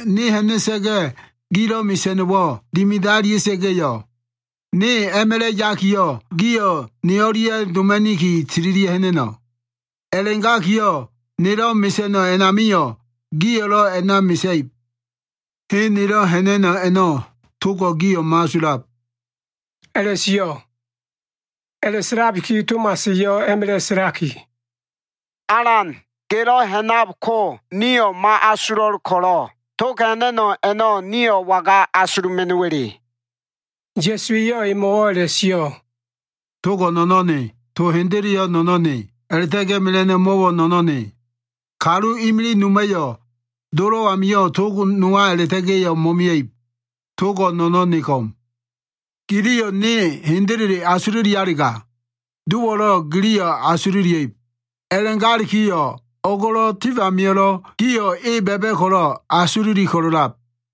Ne ha꞉na꞉sa꞉ga꞉, gilo꞉ mesa꞉no꞉wo꞉ dimida꞉lia꞉sa꞉ga꞉yo꞉, ne a꞉ma꞉la꞉ yakiyo꞉, gio꞉ ne o꞉lia꞉ doma꞉niki tililia꞉ ha꞉na꞉no꞉. A꞉la꞉gakiyo꞉ nelo꞉ mesa꞉no꞉ a꞉namio꞉, gio꞉lo꞉ a꞉na mesa꞉ib. Hen nelo꞉ ha꞉na꞉no꞉ a꞉no꞉ togo꞉ gio꞉ mo꞉asulab” a꞉la꞉sio꞉. A꞉la꞉sa꞉labiki Tomas eyo꞉ a꞉ma꞉la꞉ sa꞉laki, “Alan, gelo꞉ ha꞉nab ko, nio꞉ mo꞉asulo꞉l ko꞉lo꞉, tog ha꞉na꞉no꞉ a꞉no꞉ nio꞉ waga asuluma꞉no꞉wa꞉le?” Ya꞉su eyo꞉ emo꞉wo꞉ a꞉la꞉sio꞉, “Togo꞉ no꞉no꞉n ne. To hendeleyo꞉ no꞉no꞉n ne. A꞉la꞉ta꞉ga꞉ mela꞉no꞉ mo꞉wo꞉ no꞉no꞉n ne. Kalu imilig noma꞉yo꞉ Dolo꞉ amio꞉ tog nowa a꞉la꞉ta꞉ga꞉yo꞉ mo꞉mia꞉ib. Togo꞉ no꞉no꞉n ne ko꞉m. Giliyo꞉ ne hendele asululialega, Dowo꞉lo꞉ giliyo꞉ asululia꞉ib. A꞉la꞉galikiyo꞉ o꞉go꞉lo꞉, tif amio꞉lo꞉ gio꞉ e ba꞉ba꞉ ko꞉lo꞉ asululi ko꞉lo꞉lab.”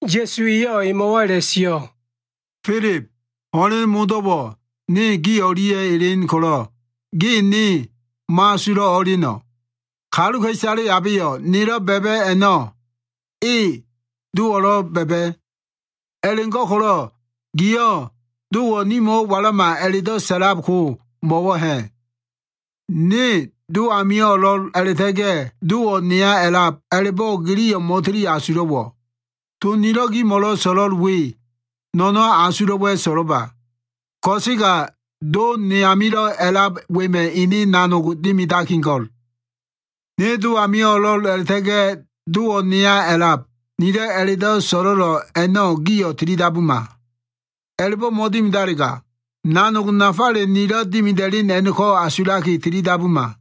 Ya꞉su eyo꞉ emo꞉wo꞉ a꞉la꞉sio꞉, “Filib, ho꞉len modo꞉wo꞉ ne gi o꞉lia꞉ elen ko꞉lo꞉ ge ne mo꞉asulo꞉ o꞉eleno꞉? Kaluka꞉isale abeyo꞉ nelo꞉ ba꞉ba꞉ a꞉no꞉, e Dowo꞉lo꞉ ba꞉ba꞉. A꞉la꞉go꞉ko꞉lo꞉ giyo꞉ ‘Dowo꞉ nimo꞉wo꞉ walama’ a꞉la꞉do꞉ sa꞉lab ko, mo꞉wo꞉ ha꞉? Ne Do ami o꞉lo꞉l a꞉la꞉ta꞉ga꞉ Dowo꞉ neya a꞉lab a꞉la꞉bo꞉ giyo꞉ mo꞉tili asulo꞉wo꞉? To nilo꞉ gimo꞉lo꞉ so꞉lo꞉l we no꞉no꞉n asulo꞉wa꞉ so꞉lo꞉ba. Ko꞉sega Do ne amilo꞉ a꞉lab wema꞉ ene nanog dimidakigo꞉l. Ne Do ami o꞉lo꞉l a꞉la꞉ta꞉ga꞉ Dowo꞉ neya a꞉lab nilo꞉ a꞉la꞉do꞉ so꞉lo꞉l a꞉no꞉ giyo꞉ tili dabuma. A꞉la꞉bo꞉ mo꞉dimidalega, nanogo꞉ nafale nilo꞉ dimida꞉len a꞉no꞉ko꞉ asulaki, tili dabuma.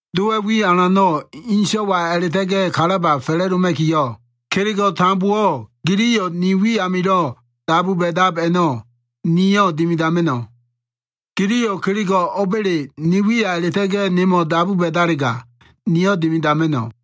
Dowa꞉ wi alano꞉ Ene So꞉waya a꞉la꞉ta꞉ga꞉ kalaba fa꞉la꞉doma꞉kiyo꞉, kelego꞉ tambowo꞉ giliyo꞉ ni wi amilo꞉ dabu ba꞉dab a꞉no꞉, niyo꞉ dimidama꞉no꞉. Giliyo꞉ kelego꞉ o꞉ba꞉le ni wiya a꞉la꞉ta꞉ga꞉ nemo꞉ dabu ba꞉dalega, niyo꞉ dimidama꞉no꞉.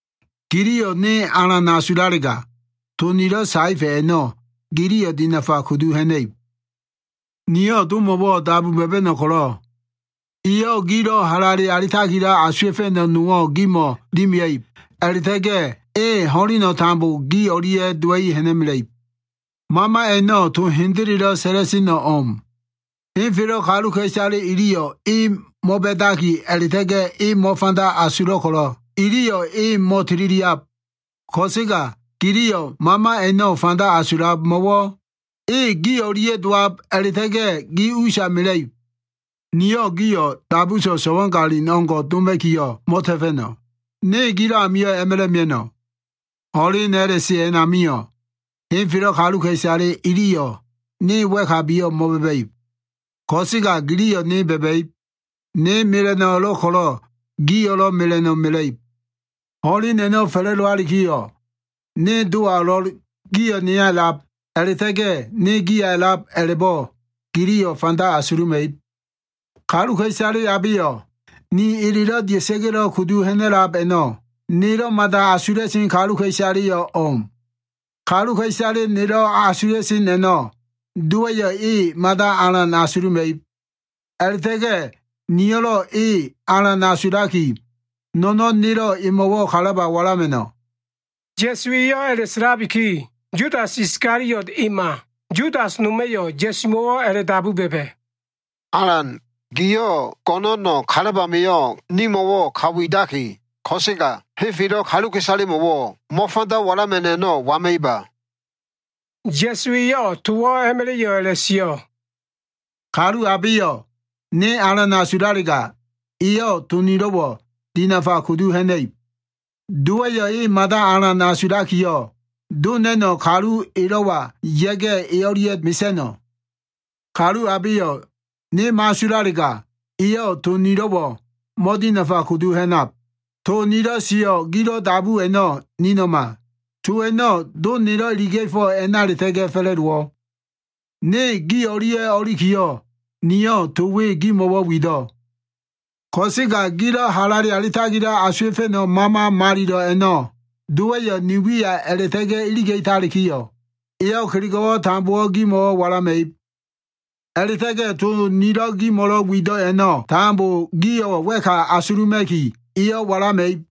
“Giliyo꞉ ne alan asulalega, to nilo꞉ saefa꞉ a꞉no꞉ giliyo꞉ dinafa kudu ha꞉na꞉ib. Niyo꞉ Domo꞉wo꞉ dabu ba꞉ba꞉no꞉ ko꞉lo꞉, eyo꞉ gilo꞉ halale alitakilo꞉ asuwa꞉fa꞉no꞉ nowo꞉ gimo꞉ dimia꞉ib a꞉la꞉ta꞉ga꞉, e ho꞉leno꞉ tambo gi o꞉lia꞉ dowa꞉i ha꞉na꞉mela꞉ib. Mama a꞉no꞉ to hendelelo꞉ sa꞉la꞉seno꞉ o꞉m. Henfelo꞉ kaluka꞉isale iliyo꞉ e mo꞉ba꞉daki a꞉la꞉ta꞉ga꞉ e mo꞉fanda asulo꞉ ko꞉lo꞉ iliyo꞉ e mo꞉tililiab. Ko꞉sega giliyo꞉ Mama a꞉no꞉ fanda asulab. Mo꞉wo꞉ e gi o꞉lia꞉ dowaki, gi usa mela꞉no꞉ mela꞉ib. “Niyo꞉ gio꞉ dabuso꞉ so꞉wagalin o꞉ngo꞉ doma꞉kiyo꞉ mo꞉ta꞉fa꞉no꞉. Ne gilo꞉ amio꞉ a꞉ma꞉la꞉ mia꞉no꞉. Ho꞉len a꞉la꞉se a꞉namio꞉, henfelo꞉ kaluka꞉isale iliyo꞉ ne wa꞉kabiyo꞉ mo꞉ba꞉ba꞉ib. Ko꞉sega giliyo꞉ ne ba꞉ba꞉ib. Ne mela꞉no꞉ o꞉lo꞉l ko꞉lo꞉ gio꞉lo꞉ mela꞉no꞉ mela꞉ib. Ho꞉len a꞉no꞉ fa꞉la꞉dowalikiyo꞉, ne Dowa o꞉lo꞉l, gio꞉ neya a꞉lab, a꞉la꞉ta꞉ga꞉ ne giya a꞉lab a꞉la꞉bo꞉ giliyo꞉ fanda asuluma꞉ib. Kaluka꞉isale abeyo꞉ ni elelo꞉ dia꞉sa꞉ga꞉lo꞉ kudu ha꞉na꞉lab a꞉no꞉, nelo꞉ mada asula꞉sen kaluka꞉isaleyo꞉ o꞉m. Kaluka꞉isale nelo꞉ asula꞉sen a꞉no꞉, Dowa꞉yo꞉ e mada alan asuluma꞉ib. A꞉la꞉ta꞉ga꞉ niyo꞉lo꞉ e alan asulaki, no꞉no꞉n nelo꞉ emo꞉wo꞉ kalaba walama꞉no꞉.” Ya꞉su eyo꞉ a꞉la꞉sa꞉labiki, Yudas Iskaliot ema, Yudas noma꞉yo꞉ Ya꞉sumo꞉wo꞉ a꞉la꞉dabu ba꞉ba꞉, “Alan, giyo꞉ go꞉no꞉no꞉ kalaba amio꞉ nimo꞉wo꞉ ka widaki, ko꞉sega henfelo꞉ kaluka꞉isalemo꞉wo꞉ mo꞉fanda walama꞉no꞉ a꞉no꞉ waima꞉iba?” Ya꞉su eyo꞉ towo꞉ a꞉ma꞉la꞉yo꞉ a꞉la꞉sio꞉, “Kalu abeyo꞉ ne alan asulalega, eyo꞉ to nilo꞉wo꞉ dinafa kudu ha꞉na꞉ib. Dowa꞉yo꞉ e mada alan asulakiyo꞉, Do na꞉no꞉ kalu elo꞉wa ya꞉ga꞉, e o꞉lia꞉ mesa꞉no꞉. Kalu abeyo꞉ ne mo꞉asulalega, eyo꞉ to nilo꞉wo꞉ mo꞉dinafa kudu ha꞉nab. To nilo꞉ sio꞉ gilo꞉ dabu a꞉no꞉ nino꞉ma. To a꞉no꞉ Do nelo꞉ iliga꞉fo꞉ a꞉na a꞉la꞉ta꞉ga꞉ fa꞉la꞉dowo꞉. “Ne gi o꞉lia꞉ o꞉ilikiyo꞉, niyo꞉ to we gimo꞉wo꞉ wido꞉. Ko꞉sega gilo꞉ halale alitakilo꞉ asuwa꞉fa꞉no꞉ Mama Malilo꞉ a꞉no꞉, Dowa꞉yo꞉ ni wiya a꞉la꞉ta꞉ga꞉ iliga꞉talikiyo꞉, eyo꞉ kelego꞉wo꞉ tambo gimo꞉ walama꞉ib. A꞉la꞉ta꞉ga꞉ to nilo꞉ gimo꞉lo꞉ wido꞉ a꞉no꞉ tambo gio꞉ wa꞉ka asuluma꞉ki, eyo꞉ walama꞉ib.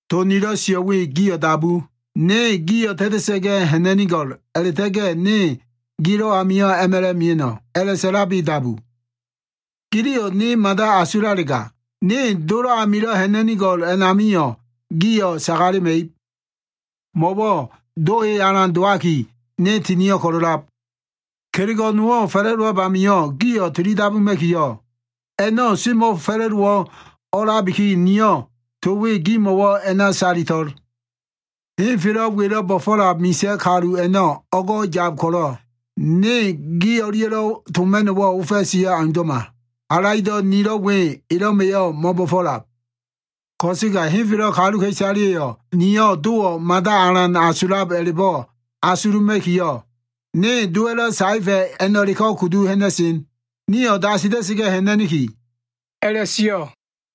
To nilo꞉ sio꞉ we gio꞉ dabu, ‘Ne gio꞉ ta꞉ta꞉sa꞉ga꞉ ha꞉na꞉nigo꞉l a꞉la꞉ta꞉ga꞉ ne gilo꞉ amio꞉ a꞉ma꞉la꞉ mia꞉no꞉’ a꞉la꞉sa꞉labi dabu. Giliyo꞉ ne mada asulalega, ne Dolo꞉ amilo꞉ ha꞉na꞉nigo꞉l a꞉namio꞉ gio꞉ sagalema꞉ib. Mo꞉wo꞉ Do e alan dowaki, ne tinio꞉ ko꞉lo꞉lab. Kelego꞉ nowo꞉ fa꞉la꞉dowab a꞉namio꞉ gio꞉ tili dabuma꞉kiyo꞉, a꞉no꞉ semo꞉fa꞉la꞉dowo꞉ o꞉a꞉labiki, niyo꞉ to we gimo꞉wo꞉ a꞉na salito꞉l. Henfelo꞉ welo꞉ bo꞉fo꞉lab misa꞉ kalu a꞉no꞉ o꞉go꞉ yab ko꞉lo꞉, ne gi o꞉lia꞉lo꞉ toma꞉no꞉wo꞉ ofa꞉siyo꞉ aundo꞉ma. Halaido꞉ nilo꞉ we elo꞉ma꞉yo꞉ mo꞉bo꞉fo꞉lab. Ko꞉sega henfelo꞉ kaluka꞉isaleyo꞉ niyo꞉ Dowo꞉ mada alan asulab a꞉la꞉bo꞉ asuluma꞉kiyo꞉, ne Dowa꞉lo꞉ saefa꞉ a꞉no꞉leko꞉ kudu ha꞉na꞉sen. Nio꞉ dasila꞉sa꞉ga꞉ ha꞉na꞉niki” a꞉la꞉sio꞉.